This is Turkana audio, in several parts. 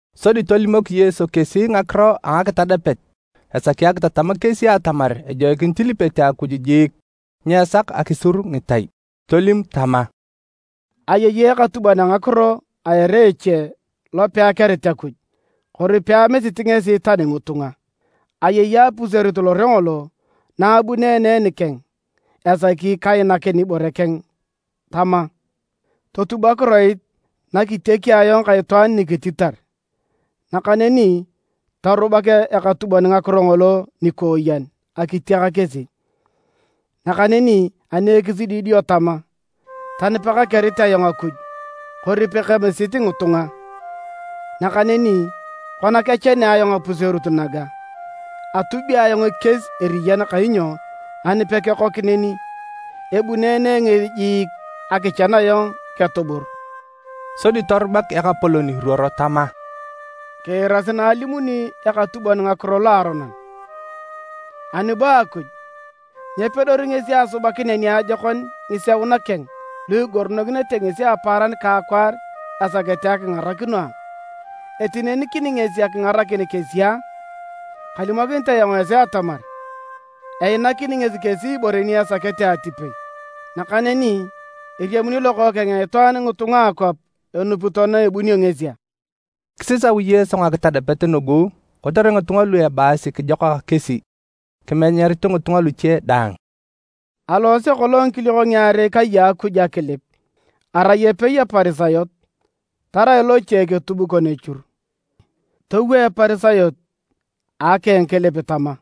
Sodi tolimok Yesu kesi ngakiro a ngakitadapet esaki akitatam kesi atamar ejoikinit ilipete Akuj jiik nyeesak akisur ngitai. Tolim tama, “Ayei ekatubon ngakiro a ere eche lo peakerit Akuj kori peamisit ngesi tani ngitunga. Ayei apuserut lore ngolo na abuneene nikeng esaki kainakin ibore keng tama, ‘Totub akiroit na kitiaki ayong ka itwaan nikititar!’ Nakaneni torubak ekatubon ngakiro ngolo nikooyen akitiak kesi, nakaneni ani ekisidi dio tama, ‘Tani pekakerit ayong Akuj kori pekemisit ngitunga, nakaneni kona kechanea ayong apuserut naga, atubi ayong ekies eriyan kainyo ani pekekok neni, ebuneene ngesi jiik akichan ayong ketubur!’” Sodi torubak Ekapolon, iruoro tama, “Kiirasi na alimuni ekatubon ngakiro loaronon. Ani bo Akuj, nyepedori ngesi asubakinea niajokon ngiseuna keng lu igoronokinete ngesi apaaran ka akwaar esakete akingarakino a? Etinenikini ngesi akingarakin kesi a? Kalimokinit ayong esi atamar, einakini ngesi kesi ibore ni esakete atipei. Nakaneni eriamuni Lokookeng a Itwaan ngitunga a akwap enupito na ebunio ngesi a?” Kisisau Yesu ngakitadapet nugu kotere ngitunga lu ebaasi kijokak kesi, kimenyarito ngitunga luche daang: “Aloose kolong ngikiliok ngiarei kai a Akuj akilip, arai epei Eparisayot, tarai loche eketubukon echur. Towo Eparisayot a akeng kilip tama,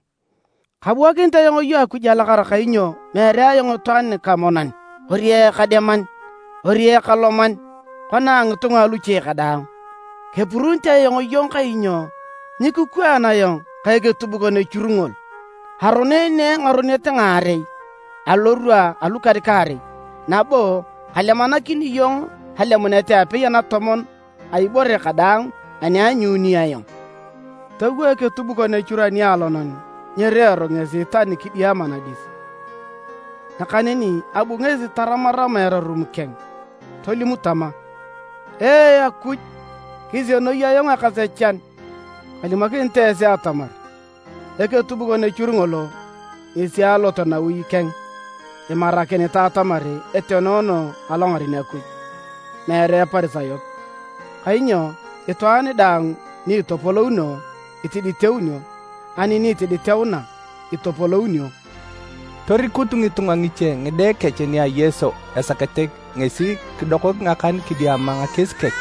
‘Kabuakinit iyong Akuj alakara kainyo meere ayong itwaan nikamonan, kori ekademan, kori ekaloman kona a ngitunga aluche kadaang. Kepuruunit ayong iyong kainyo nyikikwaan ayong ka eketubukon echur ngol. Aroneene ngaronet ngaarei alorwa alukan-kaarei, nabo kalemanakini iyong alemunet apei anatomon a ibore kadaang ani aanyuununi ayong.’ Towo eketubukon echur anialonan nyirereero ngesi tani kidiama nadis, nakaneni abu ngesi taramarama erarum keng, tolim tama, ‘Ee Akuj, kisienoi ayong ekasechan!’ Kalimokinit esi atamar, eketubukon echur ngolo ngesi alot nawi keng imarakinitae atamar etenoono alongaren Akuj, meere Eparisayot, kainyo itwaan daang ni itopolouno, itiditeunio, ani ni itiditeuna, itopolounio.” Torikut ngitunga ngiche ngide kech nia Yesu esakete ngesi kidokok ngakan kidiama ngakies kech.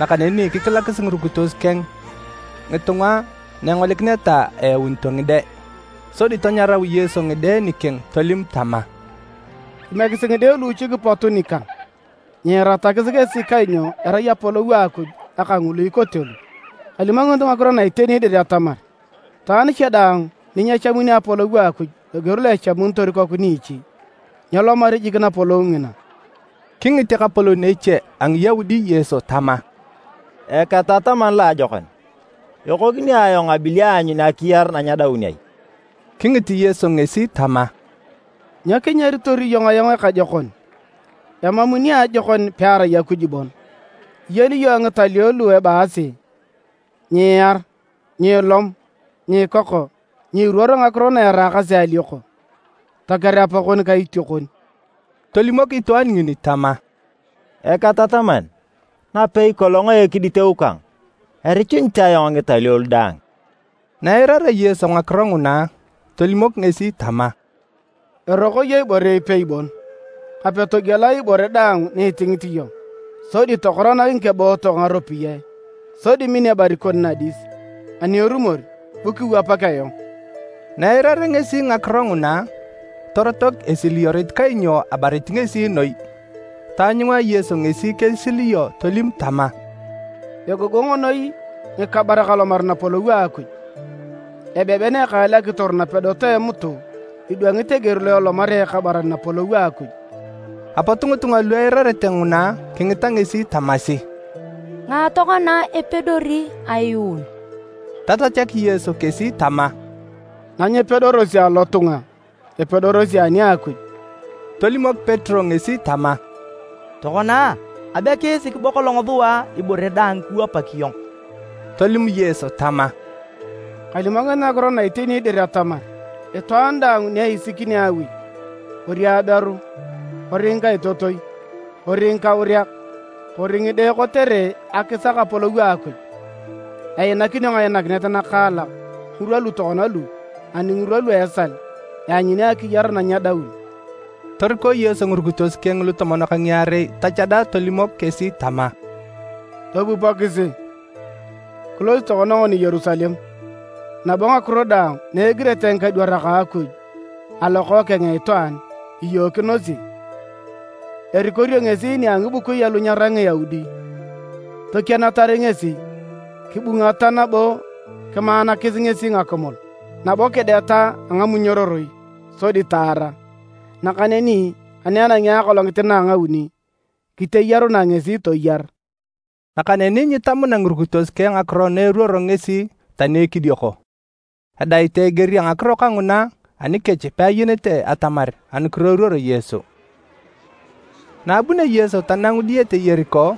Nakaneni kikilakis ngirukitos keng ngitunga na engolikineta eyaunito ngide, sodi tanyarau Yesu ngide nikeng tolim tama, “Kimiekisi ngide luuchik pot nikang! Nyiiratakis kesi kainyo erai Apolou a Akuj aka ngulu ikote lu. Kalimokinit ngakiro na iteni atamar, itwaan cha daang ni nyechamuni Apolou a Akuj loger lo echamunitor ikoku niichi, nyelomari jik Napolou ngina.” Kingit ekapolon eche a Ngiyaudi Yesu tama, “Eketataman loajokon, ekokini ayong abili aanyun akiyar na nyedaun ai?” Kingit Yesu ngesi tama, “Nyo kinyaritor iyong ayong ekajokon? Emam niajokon pearai Akuj bon. Iyeni iyong ngitalio lu ebaasi: ‘Nyiiar, nyiilom, nyiikoko, nyiiruor ngakiro na eraakasi alioko, toker apakon ka itiokon.’” Tolimok itwaan ngini tama, “Eketataman, napei kolong a ekiditeu kang, erichunit ayong ngitalio lu daang.” Na eirarea Yesu ngakiro nguna, tolimok ngesi tama, “Eroko iyong ibore ipei bon. Kape togiela ibore daang ni itingit iyong, sodi tokoranak ngikebootok ngaropiyae sodi min ebarit kon nadis. Ani erumor, bu kiwapak ayong.” Na eirarea ngesi ngakiro nguna, torotok esiliyorit kainyo abarit ngesi noi. Taanyunga Yesu ngesi kesiliyo tolim tama, “Egogong noi ngikabarak alomar Napolou a Akuj! Ebeben ekaal akitor napedot a emutu idwangit eger lo elomarea ekabaran Napolou a Akuj.” Apot ngitunga lu eirarete nguna kingita ngesi tamasi, “Ngae tokona epedori ayuun?” Tatachak Yesu kesi tama, “Na nyepedorosi alotunga, epedorosi ani a Akuj!” Tolimok Petero ngesi tama, “Tokona! Abe kiisik bo kolong sua ibore daang kiwapak iyong.” Tolim Yesu tama, “Kalimokinit ngakiro na iteni dir atamar, itwaan daang ni eisikini awi, kori aberu, kori ngikaitotoi, kori ngikauriak, kori ngide kotere akisak Apolou a Akuj, einakinio ngainakinet nakaalak ngirwa lu tokona lu ani ngirwa lu a esal, eanyuni akiyar na nyedaun.” Toriko Yesu ngirukitos keng lutomon ka ngiarei tachada tolimok kesi tama, “Topupokisi! Kilosi tokona ngoni Yerusalem, nabo ngakiro daang na egirete ngikadwarak a Akuj ani a Lokookeng a Itwaan, iyookinosi. Erikorio ngesi nia ngibukui alu nyerai Ngiyaudi, tokienatar ngesi, kibungata nabo kimaanakis ngesi ngakimul. Nabo kideta a ngamunyororoi, sodi taara, nakaneni ani enangi akolongit na a ngauni kiteyarunae ngesi toyar.” Nakaneni nyitamuna ngirukitos keng ngakiro na eruoro ngesi tani ekidioko, edaitae eger a ngakiro kanguna anikech peayenete atamar anukiro eruoro Yesu. Na abunio Yesu tanangu diyete Yeriko,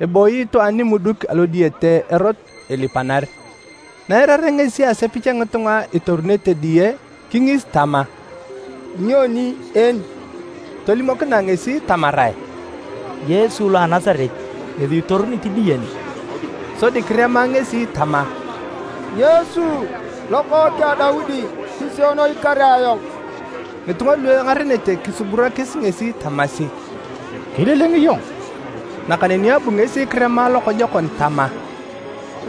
ebooyi itwaan nimuduk alodiyete erot ilipanar. Na eirarea ngesi asepich a ngitunga itorunete diye, kingis tama, “Nyoni en?” Tolimokinae ngesi tamarae, “Yesu lo a Nasaret ngesi itorunit diye ne.” Sodi kirema ngesi tama, “Yesu! Lokookeng a Daudi! Kisienoi kare ayong!” Ngitunga lu engarenete kisuburakis ngesi tamasi, “Kililing iyong.” Nakaneni abu ngesi kirema lokojokon tama, “Lokookeng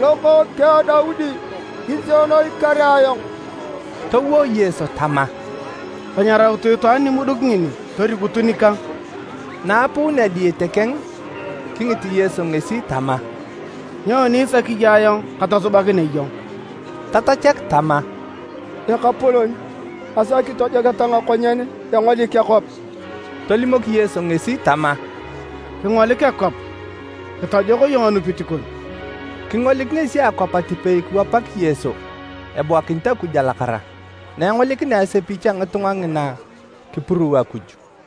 a Daudi! Kisienoi kare ayong!” Towo Yesu tama, “Tanyarautu itwaan nimuduk ngini torikutu nikang.” Na apuunea diyete keng, kingit Yesu ngesi tama, “Nyoni isaki iyong ayong katosubakinea iyong?” Tatachak tama, “Ekapolon, asaki tojoketa ngakonyen engolik akwap.” Tolimok Yesu ngesi tama, “Kingolik akwap! Kitojok iyong anupit kon.” Kingolik ngesi akwap atipei kiwapak Yesu, ebuakinit Akuj alakara. Na engolikinea asepich a ngitunga ngina, kipuruu Akuj.